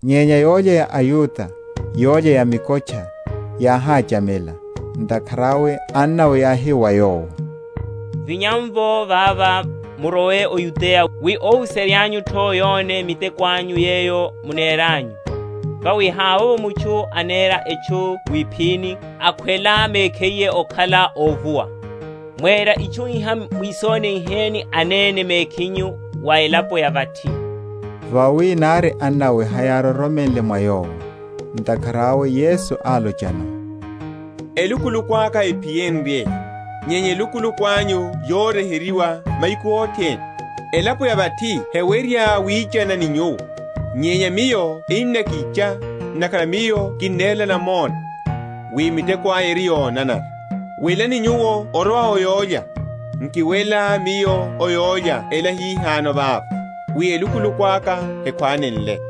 Nyenya, yólya ya aYuda, yólya ya mikotcha, yáhachamela. Ntakhara awe annawe yáhi wa Yowo, Vinya’mvo vava, murowe o Yudeya, wi óhuserya’nyu’tho yone miteko anyu yeyo muneranyu. Vawi havovo mutchu anera etchu wiphini, akhwela mekhiye okhala óvuwa. Mwera itchu iha, mwisoniheni anene mekhinyu wa elapo ya vathi. Vawi nari annawe hayároromela mwa Yowo. Ntakhara awe Yesu álochano, Elukuluku aka hephiyenrye; nyenya elukuluku anyu yoryeheryiwa mahiku othene. Elapo ya vathi hewerya wichana ni nyuwo; nyenya Miyo ennakicha, ntakhara Miyo kinnerela namona, wi miteko aya eri yonanara. Welani nyuwo orowa o yólya; nkiwela Miyo o yólya ela hihano vava; wi elukuluku aka hekhwánenle.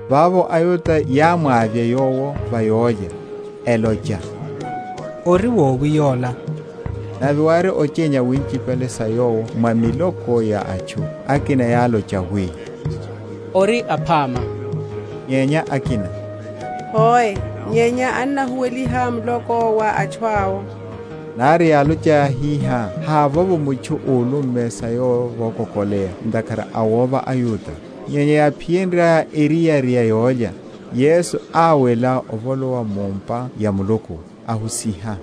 Vavo aYuda yámwavya Yowo va yólya, elocha, Ori wowi yola? Nave wári ochenya winchipale sa Yowo mwa miloko ya atchu: akina yálocha, wi, Ori aphama; nyenya akina, Hoe, nyenya annahuweliha muloko wa atchu awo. Nari yálochaya hihá havovo mutchu úlumme sa Yowo vokokoleya ntakhara a wova aYuda. Nyenya yáphiyenryaya eriyari ya yólya, Yesu áwela avolowa mu’mpa ya Muluku, ahusiha.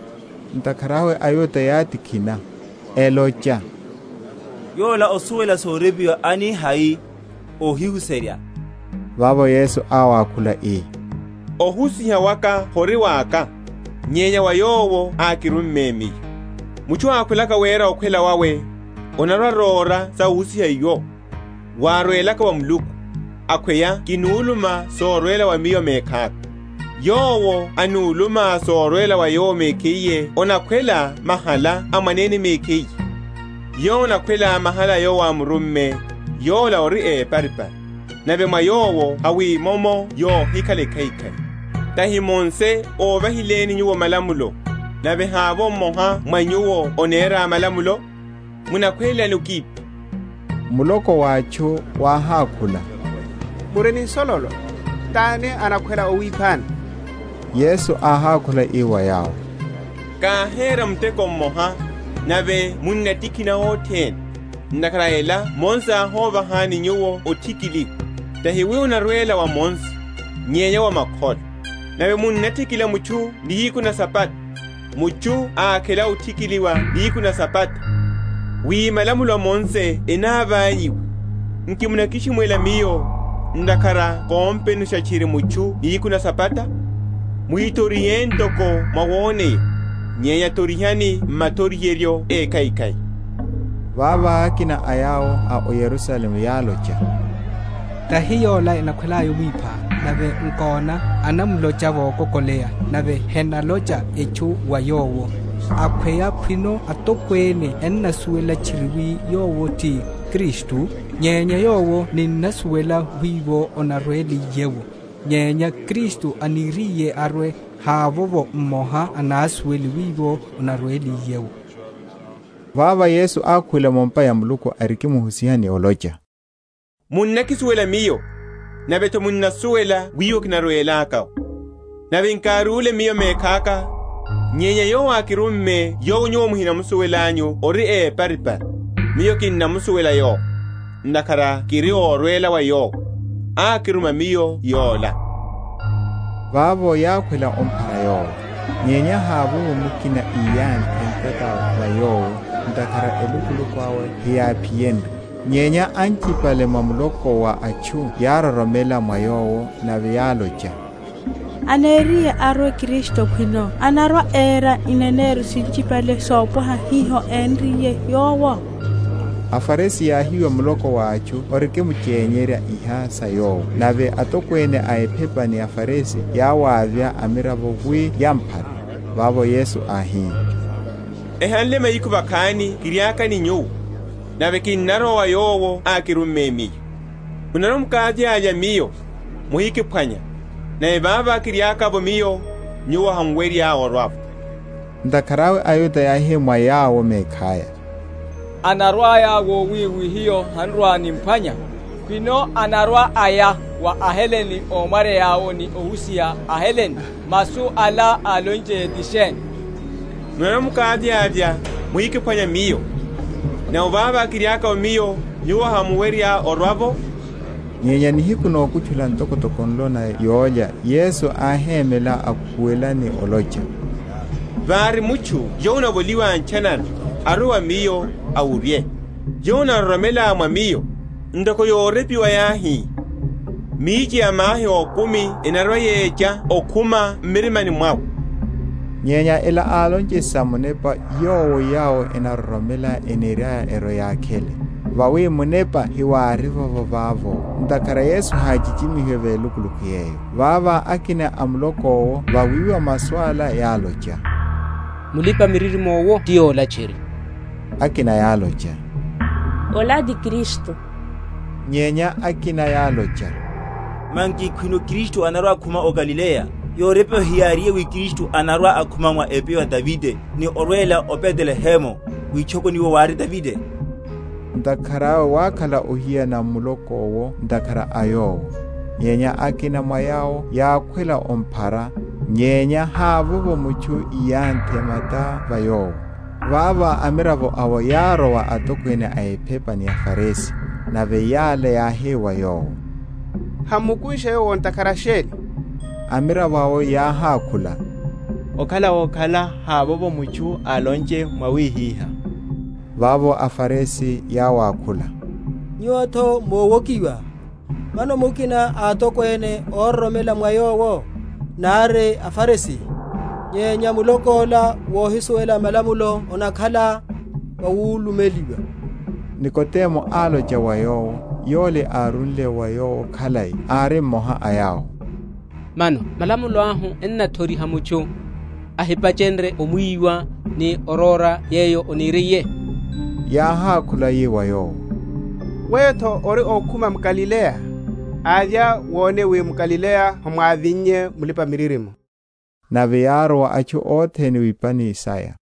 Ntakhara awe aYuda yátikhina, elocha, Yola osuwela sorepiwa ani hai, óhihuserya? Vavo Yesu áwakhula, ii, Ohusiha waka hori waka, nyenya wa Yowo ákirumme Miyo. Mutchu ákhwelaka wera okhwela wawe, anarwa‐aróra sa ohusiha iwo, wárwelaka wa Muluku, akhweya kinuluma sorwela wa Miyo mekhaka. Yowo anuluma sorwela wa Yowo mekhiye anakhwela mahala a mwanene mekhiye. Yowo anakhwela mahala a Yowo ámurumme, yola ori éparipari, nave mwa Yowo hamwimomo yohikhala ekhaikhai. Tahi Mose óvahileni nyuwo malamulo, nave havovo mmoha mwa nyuwo anera malamulo? Munakhwelelani okipha? Muloko wa atchu wáhakhula, Muri ni nsololo: tani anakhwela owiphani? Yesu áhákhula ii wa yawo, Káhera muteko mmoha, nave munnatikhina othene. Ntakhara a ela Mose áhovahani nyuwo othikiliwa (tahi wi onarwela wa Mose, nyenya wa makholo); nave munnathikila mutchu nihiku na Sabata. Mutchu ákhela othikiliwa nihiku na Sabata, wi malamulo a Mose enavanyihiwe; nki munakishimwela Miyo, ntakhara kompenusha tchiri mutchu nihiku na Sabata? Muhithorihe ntoko mwawoneya, nyenya thorihani mathoriheryo ékhaikhai. Vavo akina a yawo a o Yerusalemu yálocha, Tahi yola enakhwelaya omwipha? nave nkona, anamlocha vokokoleya, nave henalocha etchu wa Yowo. Akhweya khwino atokwene ennasuwela tchiri wi yowo ti Kristu? Nyenya Yowo ninnasuwela wiwo anarweliye’wo: nyenya Kristu aniriye arwe, havovo mmoha anasuwele wiwo anarweliye’wo. Vavo Yesu ákhuwela mu’mpa ya Muluku, arikimuhusiha ni olocha, Munnakisuwela Miyo, nave’tho munnasuwela wiwo kinarwelaka’wo; nave nkárúle Miyo mekhaka, nyenya Yowo ákirumme yowo nyuwo muhinamusuwelanyu ori éparipari. Miyo kinnamusuwela Yowo; ntakhara kiri órwela wa Yowo, ákiruma Miyo Yola. Vavo yákhwela omphara Yowo: nyenya havovo mukina íyanthe ntata va Yowo, ntakhara elukuluku awe heyáphiyenrye. Nyenya anehipale mwa muloko wa atchu yároromela mwa Yowo; nave yálocha, Aniriye arwe Kristu khwino anarwa‐era ineneryo sinchipale sopwaha hiho énriye Yowo? AFarisi yáhiwa muloko wa atchu orikimuchenyerya iha sa Yowo; nave atokwene a ephepa ni aFarisi yáwavya amiravo wi yamphare. Vavo Yesu áhi, Ehanle mahiku vakhani kiriaka ni nyuwo, nave kinarowa wa Yowo ákirumme Miyo. Munarwa‐mukavyavya Miyo, muhikiphwanya; nave vavo kiriaka’vo Miyo, nyuwo hamuwerya orwa’vo. Ntakhara awe aYuda yáhi mwa yawo mekhaya, Anarwa‐aya wowi wi hiyo han’rwa‐nimphwanya? khwino anarwa‐aya wa aHelene ómwaryeya’wo, ni ohusiha aHelene? Masu ala álonchiye ti sheni, Munarwa‐mukavyavya, muhikiphwanya Miyo: nave vavo kiriaka’vo Miyo, nyuwo hamuwerya orwa’vo? Nyenya nihiku nokutchula, ntokotoko nlo na yólya Yesu áhémela akhuwela, ni olocha, Vári mutchu yowo anavoliwa ntchanana, arwe wa Miyo, awurye. Yowo anaroromela mwa Miyo, ntoko yorepiwa yáhi, Mihiche ya mahi ókumi enarwa‐yecha okhuma m’mirimani mwawe. Nyenya ela álonche sa Munepa, yowo yawo enaroromela eniryaya erwe‐yakhele; vawi Munepa hewárivovo vavo, ntakhara Yesu háchichimi?-?hiwe velukuluku yeyo. Vavo akina a muloko’wo vawiwa masu ala, yálocha, Mulipa‐miririmo’wo ti yola tchiri. Akina yálocha, Ola ti Kristu. Nyenya akina yálocha, Manki khwino Kristu anarwa okhuma o Galileya? Yorepiwa heyáriye wi Kristu anarwa‐akhuma mwa epyo ya Davide, ni orwela o Betelehemu, witchokoni wiwo wári Davide? Ntakhara awe wákhala ohiyana m’muloko’wo ntakhara a Yowo. Nyenya akina mwa yawo yákhwela omphara; nyenya havovo mutchu íyanthe mata va Yowo. Vavo amiravo awo yárwa wa atokwene a ephepa ni aFarisi; nave yala yáhi wa yawo, Hammukunshe Yowo ntakhara sheni? Amiravo awo yáhákhula, Okhala wokhala havovo mutchu álonche mwawihihá. Vavo aFarisi yáwakhula, Nyuwo’to mówokiwa? Mano mukina a atokwene ároromela mwa Yowo, nari a aFarisi? Nyenya muloko ola wohisuwela malamulo, onakhala wawulumeliwa. Nikodemo álocha wa yawo, yole árúle wa Yowo khalai, ari mmoha a yawo, Mano malamulo ahu ennathoriha mutchu, ohipacherya omwiwa, ni oróra yeyo aneriye? Yáhákhula yi wa yowo, Weyo’tho ori ókhuma m’Galileya? Avya, wone wi m’Galileya hemwávinnye mulipa‐miririmo. Nave yárowa atchu othene wipani saya.